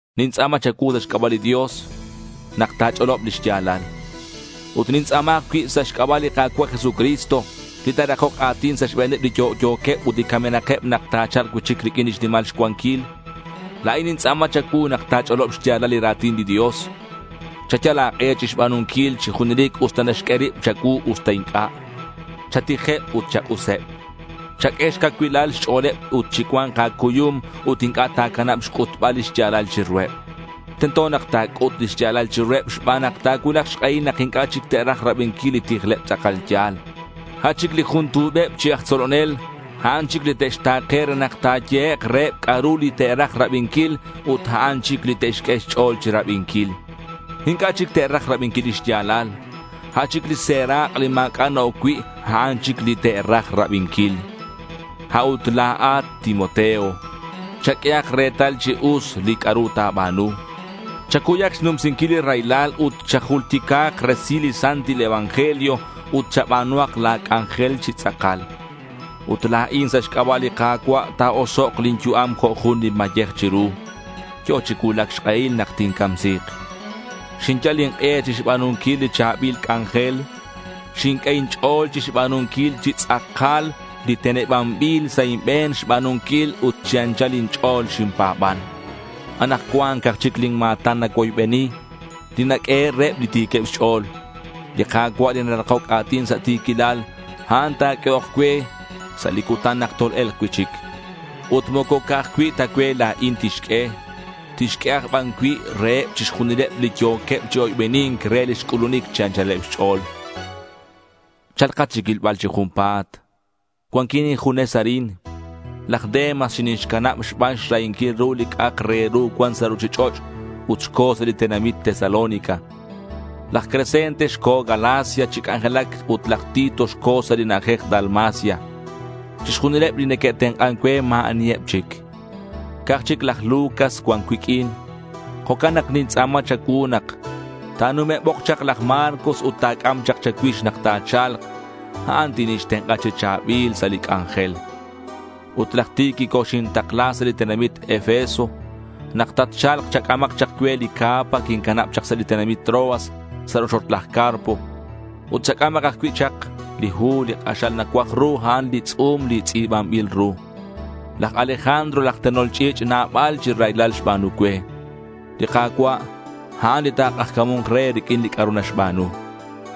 Nintz'a̱ma cha̱cuu sa' xc'aba' li Dios nak ta̱ch'olob li xya̱lal. Ut nintz'a̱ma ajcui' sa' xc'aba' li Ka̱cua' Jesucristo, li ta̱rakok a̱tin sa' xbe̱neb li yo'yo̱queb ut li camenakeb nak ta̱cha̱lk cui'chic riq'uin lix nimal xcuanquil. La̱in nintz'a̱ma cha̱cuu nak ta̱ch'olob xya̱lal li ra̱tin li Dios. Chayal a̱k'e chixba̱nunquil chi junelic usta naxq'ue rib cha̱cuu usta inc'a'. Chatijeb ut chak'useb. Chaq'ue xcacuilal xch'o̱leb ut chicua̱nk a̱cuyum ut inc'a' ta̱canab xc'utbal li xya̱lal chiruheb. Tento nak ta̱c'ut li xya̱lal chiruheb xban nak ta̱cuulak xk'ehil nak inc'a' chic te'raj rabinquil li tijleb tz'akal ya̱l. A' chic li jun tu̱beb chi aj tzolonel, a'an chic li te'xta̱ke re nak ta̱yehek' reheb c'a'ru li te'raj rabinquil ut a'an chic li te'xq'ue xch'o̱l chirabinquil. Inc'a' chic te'raj rabinquil lix ya̱lal. A' chic li serak' li ma̱c'a' na-oc cui', a'an chic li te'raj rabinquil. A'ut la̱at, Timoteo, chaq'uehak retal chi us li c'a'ru ta̱ba̱nu. Chacuyak xnumsinquil li raylal ut chajultica̱k resil li santil evangelio ut chaba̱nuhak la̱ c'anjel chi tz'akal. Ut la̱in, sa' xc'aba' li Ka̱cua' ta̱osok' lin yu'am jo' jun li mayej chiru. Yo̱ chi cuulac xk'ehil nak tincamsi̱k. Xinyal ink'e chixba̱nunquil li cha̱bil c'anjel. Xinq'ue inch'o̱l chixba̱nunquil chi tz'akal li tenebanbil sa' inbe̱n xba̱nunquil ut chi anchal inch'o̱l xinpa̱ban. Anakcuan ca'aj chic lin ma̱tan nacuoybeni li naq'uehe' reheb li ti̱queb xch'o̱l. Li Ka̱cua' li narakoc a̱tin sa' ti̱quilal, a'an ta̱q'uehok cue sa' li cutan nak tol-e̱lk cui'chic. Ut moco ca'aj cui' ta cue la̱in tixq'ue. Tixq'ue aj ban cui' reheb chixjunileb li yo̱keb chi oybeni̱nc re lix c'ulunic chi anchaleb xch'o̱l. Cha̱lkat chicuilbal chi junpa̱t. Cuanquin injunes arin. Laj Demas xinixcanab xban xrahinquil ru li c'a'ak re ru cuan sa' ruchich'och' ut xco̱ sa' li tenamit Tesalónica. Laj Crescente xco̱ Galacia chi c'anjelac ut laj Tito xco̱ sa' li na'ajej Dalmacia. Chixjunileb li neque'tenk'an cue ma̱ aniheb chic. Ca'aj chic laj Lucas cuan cuiq'uin. Jo'can nak nintz'a̱ma cha̱cuu nak ta̱nume'bok chak laj Marcos ut ta̱c'am chak cha̱cuix nak tatcha̱lk. A'an tinixtenk'a chi cha̱bil sa' li c'anjel. Ut laj Tíquico xintakla sa' li tenamit Efeso. Nak tatcha̱lk, chac'amak chak cue li capa quincanab chak sa' li tenamit Troas sa' rochoch laj Carpo. Ut chac'amak ajcui' chak li hu. Li k'axal nacuaj ru, a'an li tz'u̱m li tz'i̱banbil ru. Laj Alejandro, laj tenol ch'i̱ch', nabal chi raylal xba̱nu cue. Li Ka̱cua', a'an li ta̱k'ajca̱mu̱nk re riq'uin li c'a'ru naxba̱nu.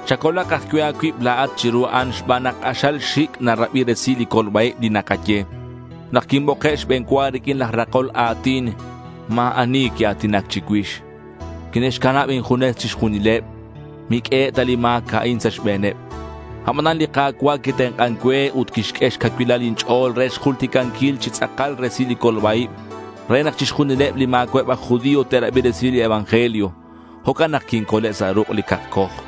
Chacolak ajcui' a̱cuib la̱at chiru a'an xban nak k'axal xi̱c' narabi resil li colba-ib li nakaye. Nak quinboke' xbe̱n cua riq'uin laj rakol a̱tin, ma̱ ani quia̱tinac chicuix. Quine'xcanab injunes chixjunileb. Miq'uehe' ta li ma̱c a'in sa' xbe̱neb. Abanan li Ka̱cua' quitenk'an cue ut quixq'ue xcacuilal inch'o̱l re xjulticanquil chi tz'akal resil li colba-ib re nak chixjunileb li ma̱cua'eb aj judío te'rabi resil li evangelio. Jo'can nak quincole' sa' ruk' li cakcoj.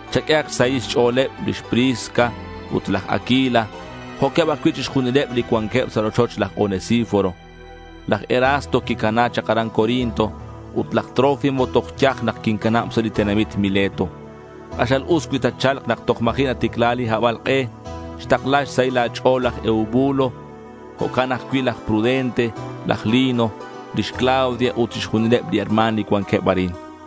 Chaq'ueheb xsahil xch'o̱leb lix Prisca ut laj Aquila jo'queb ajcui' chixjunileb li cuanqueb sa' rochoch laj Onesíforo. Laj Erasto quicana chak aran Corinto. Ut laj Trófimo toj yaj nak quincanab sa' li tenamit Mileto. K'axal us cui tatcha̱lk nak toj ma̱ji' naticla li habalk'e. Xtakla xsahil a̱ch'o̱l laj Eubulo, jo'queb ajcui' laj Pudente, laj Lino, lix Claudia ut chixjunileb li herma̱n li cuanqueb arin.